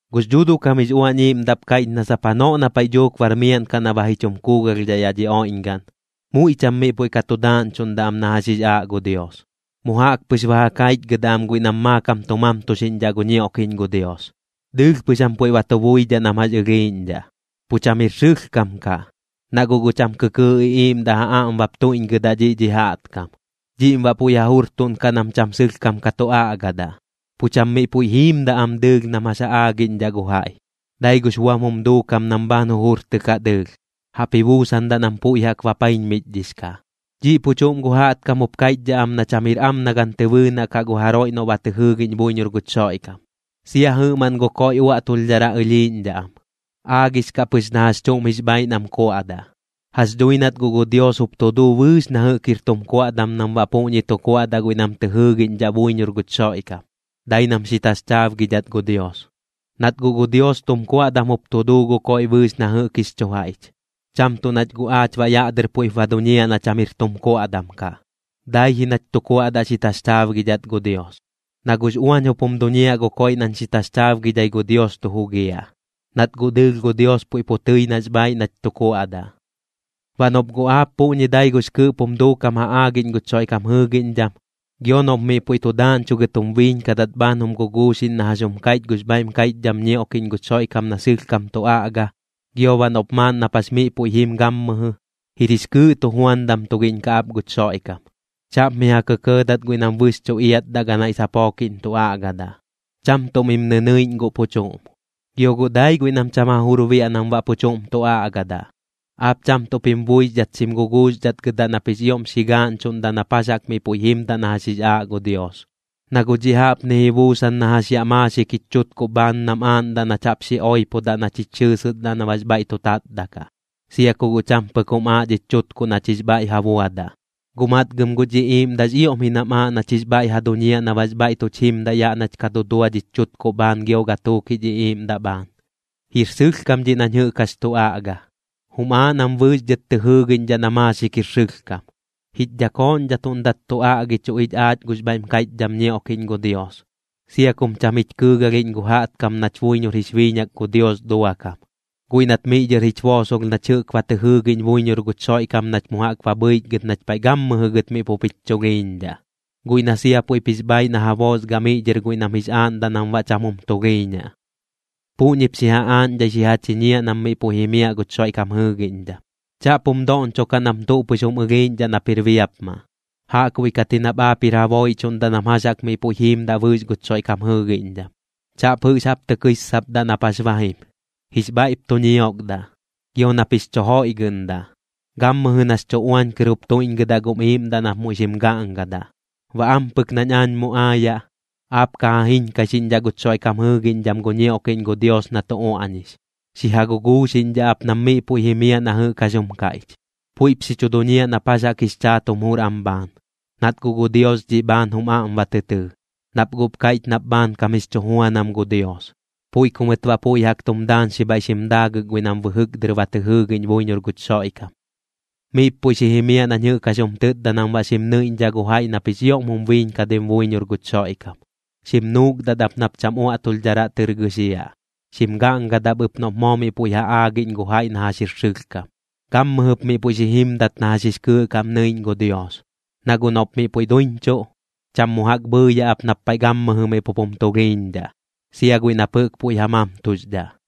Gux Dhuuduꞌ kam jix Uañ Iiꞌmdaꞌp kaiꞌch na sap janoꞌ na paiꞌ dhuuk bar miaꞌn kaꞌ na ba ji chum kuugalhdhaꞌ yaꞌ dhi oiꞌñgaꞌn, muiꞌ cham miꞌ puiꞌ ka tu daaꞌñchuꞌndaꞌ am na jax jix aaꞌ gu Dios. Mu jaꞌk pɨx ba ja kaichgɨdaꞌ am guiꞌ nam maakam tu mamtuxiꞌñdhaꞌ gu ñioꞌkiꞌñ gu Dios, dɨɨlh pɨx jam puiꞌ ba tu buidhaꞌ nam jax ɨlhiiꞌñdhaꞌ. Pu cham jir sɨlhkam kaꞌ, na guꞌ gu cham kɨkɨɨꞌ iꞌiiꞌmdaꞌ ja aꞌm bap tuiꞌñgɨdaꞌ dhiꞌ dhi jaꞌtkam, dhiꞌm baꞌ puiꞌ ja jurtuꞌnkaꞌ nam cham sɨlhkam ka tu aꞌgadaꞌ. Pu cham miꞌ puiꞌ jiimdaꞌ am dɨɨlh nam jax jaꞌk ja aagiꞌñdhaꞌ gu jaiꞌ, dai gux buam jum duukam nam bhaan jujurtɨkaꞌ dɨɨlh, jaꞌp ji buusandaꞌ nam puiꞌ jaꞌk bapaiñmichdhix kaꞌ. Dhiꞌ pu chuꞌm gu jaꞌtkam jup kaiꞌchdhaꞌ am na cham jir am na gan tɨ bɨɨnaꞌ kaꞌ gu jaroiꞌ noꞌ ba tɨ jɨɨgiꞌñ buiñor guch Xoiꞌkam. Sia jɨꞌmaꞌn gu koiꞌ uaꞌtulhdharaꞌ ɨlhiiꞌñdhaꞌ am, aagix kaꞌ pɨx na jax chuꞌm jix bhaaiꞌ nam kuaꞌdaꞌ. Jax dhui nat guꞌ gu Dios jup tu duu bɨɨx na jɨꞌk jir tum kuaꞌdam nam baꞌ puꞌñi tu kuaꞌdaꞌ guiꞌ nam tɨ jɨɨgiꞌñdhaꞌ buiñor guch Xoiꞌkam, dai nam xi taxchaabgidhat gu Dios. Nat guꞌ gu Dios tum kuaꞌdam jup tu duu gu koiꞌ bɨɨx na jɨꞌk jix chu jaiꞌch, cham tuꞌ nach guꞌ aach baꞌ yaꞌ dɨr puiꞌp ba duñiaꞌ na cham jir tum kuaꞌdam kaꞌ, dai ji nach tu kuaꞌdaꞌ xi taxchaabgidhat gu Dios. Na guꞌx uañ jup jum duñiaꞌ gu koiꞌ nañ xi taxchaabgidhai gu Dios tu jugiaꞌ, nat guꞌ dɨɨlh gu Dios puiꞌ pu tɨi nax bhaaiꞌ nach tu kuaꞌdaꞌ. Baꞌ noꞌp guꞌ aap puꞌñi dai gux kɨɨꞌp jum duukam ja aagiꞌñ guch Xoiꞌkam jɨɨgiꞌñdham, gio noꞌp miꞌ puiꞌ tu daaꞌñchugɨt jum biiñkadat bhaan jum guguuxiꞌñ na jax jum kaiꞌch gux bhaiꞌm kaiꞌchdham ñioꞌkiꞌñ gu Xoiꞌkam na sɨlhkam tu aꞌga, gio baꞌ noꞌp maaꞌn nap jax miꞌ puiꞌ jim gammɨjɨ, jir jix kɨɨꞌ tujuandam tugiꞌñ kaꞌ ap guch Xoiꞌkam. Chaꞌp mi ja kɇkɇɇdat guiꞌ nam bɨxchuꞌ iatdaꞌ ganaiꞌ sapookiꞌñ tu aꞌgadaꞌ. Cham tuꞌ mim nɨnɨiꞌñ gu pu chuꞌm, gio guꞌ dai guiꞌ nam cham ja jur biaꞌ nam baꞌ pu chuꞌm tu aꞌgadaꞌ. Aap cham tuꞌp jim buixdhat xim guguuxdhatgɨdaꞌ nap jix ioꞌm xi gaaꞌñchuꞌndaꞌ nap jax jaꞌk miꞌ puiꞌ jimdaꞌ na jax jix aaꞌ gu Dios. Na guꞌ dhiꞌ jaꞌpni ji buusan na jax yaꞌ maaxik jich chutkuꞌ bhaan nam aaꞌndaꞌ nach jaꞌp xi oipodaꞌ nach jich xɨɨsɨsdaꞌ na baꞌx bhaiꞌ tu tatdaꞌ kaꞌ, sia ku guꞌ cham pɨk jum aaꞌ dhich chutkuꞌ nach jix bhaiꞌ ja buadaꞌ. Guꞌ matgɨm guch iꞌiiꞌmdaꞌx ioꞌm ji nam aaꞌ nach jix bhaiꞌ ja duñiaꞌ na baꞌx bhaiꞌ tuch jimdaꞌ yaꞌ nach ka dudua dhich chuukuꞌ bhaan gio gatuuk jich iꞌiiꞌmdaꞌ bhaan. Jir sɨlhkam dhiꞌ nañ jɨꞌk jax tu aꞌga. Jum aaꞌ nam bɨɨx dhɨt tɨ jɨɨgiꞌñdhaꞌ na maaxik jir sɨlhkam. Jich dhakooꞌñdhatuꞌndat tu aꞌgichuꞌ ich aach gux bhaiꞌm kaiꞌchdham ñioꞌkiꞌñ gu Dios, sia kum cham jich kɨɨgalhiꞌñ gu jaꞌtkam nach buiñor jix biiñak gu Dios duakam, guiꞌ nat miꞌ dhɨr jich boosolh nach jɨꞌk ba tɨ jɨɨgiꞌñ buiñor guch Xoiꞌkam nach mu jaꞌk ba bhɨichgɨt nach paiꞌ gammɨjɨ gɨt miꞌ pup jich chulhiiñdhaꞌ, guiꞌ na sia puiꞌp jix bhaaiꞌ na ja boosgaꞌ miꞌ dhɨr guiꞌ nam jix aaꞌndaꞌ nam baꞌ cham jum tulhiiñaꞌ. Puꞌñip xi ja aaꞌñdhai xi ja chiñiaꞌ nam miꞌ puiꞌ jimiaꞌ guch Xoiꞌkam jɨɨgiꞌñdham. Chaꞌp jum doꞌñchokaꞌ nam tuꞌ pɨx jum ɨlhiiꞌñdhaꞌ nap jir biapmaꞌ, jaꞌkbuiꞌ kat ji nap aap jir ja booiꞌchuꞌndaꞌ nam jax jaꞌk miꞌ puiꞌ jiimdaꞌ bɨɨx guch Xoiꞌkam jɨɨgiꞌñdham. Chaꞌp jɨꞌx jaꞌp tɨ kɨissapdaꞌ nap jax ba jim, jix bhaiꞌp tu ñiokdaꞌ, gio nap jix chu joiꞌgɨꞌndaꞌ, gammɨjɨ nax chu uañ kɨr jup tuiꞌñgɨdaꞌ gum iiꞌmdaꞌ nap muiꞌ xim gaꞌngadaꞌ. Baꞌ ampɨk nañ aañ mu aayaꞌ, aap ka ja jiñkaixiꞌñdhaꞌ guch Xoiꞌkam jɨɨgiꞌñdham gu ñioꞌkiꞌñ gu Dios na tu uaꞌñix, xi ja guguuxiꞌñdhaꞌ ap nam miꞌ puiꞌ jimiaꞌ na jɨꞌk jax jum kaiꞌch. Puiꞌp xi chu duñiaꞌ nap jax jaꞌk jix chaat jum jur am bhaan, nat guꞌ gu Dios dhiꞌ bhaan jum aꞌm ba tɨ tɨɨ. Nap guꞌp kaiꞌch nap bhaankam jix chu juanam gu Dios, puiꞌ ku mɨt baꞌ puiꞌ jaꞌk tum daañxi bhaiꞌ xim daagɨk guiꞌ nam bɨjɨk dɨr ba tɨ jɨɨgiꞌñ buiñor guch Xoiꞌkam. Miꞌp puiꞌ xi jimiaꞌ nañ jɨꞌk jax jum tɨtda nam baꞌ xim nɨiꞌñdhaꞌ gu jaiꞌ nap jix ioꞌm jum biiñkadim buiñor guch Xoiꞌkam. Xim nuukdat ap nap cham uaꞌtulhdharaꞌ tɨr gɨxiaꞌ. Xim gaꞌngadaꞌp ɨp noꞌp moo miꞌ puiꞌ ja aagiꞌñ gu jaiꞌ na jax jir sɨlhkam. Gammɨjɨp miꞌ puiꞌ xi jimdat na jax jix kɨɨꞌ kaꞌm nɨiꞌñ gu Dios, na guꞌ noꞌp miꞌ puiꞌ duiñchuꞌ, cham mu jaꞌk bhɨɨyaꞌ ap nap paiꞌ gammɨjɨ miꞌ pup jum tulhiiñdhaꞌ, sia guiꞌ nap jɨꞌk puiꞌ ja mamtuxdhaꞌ.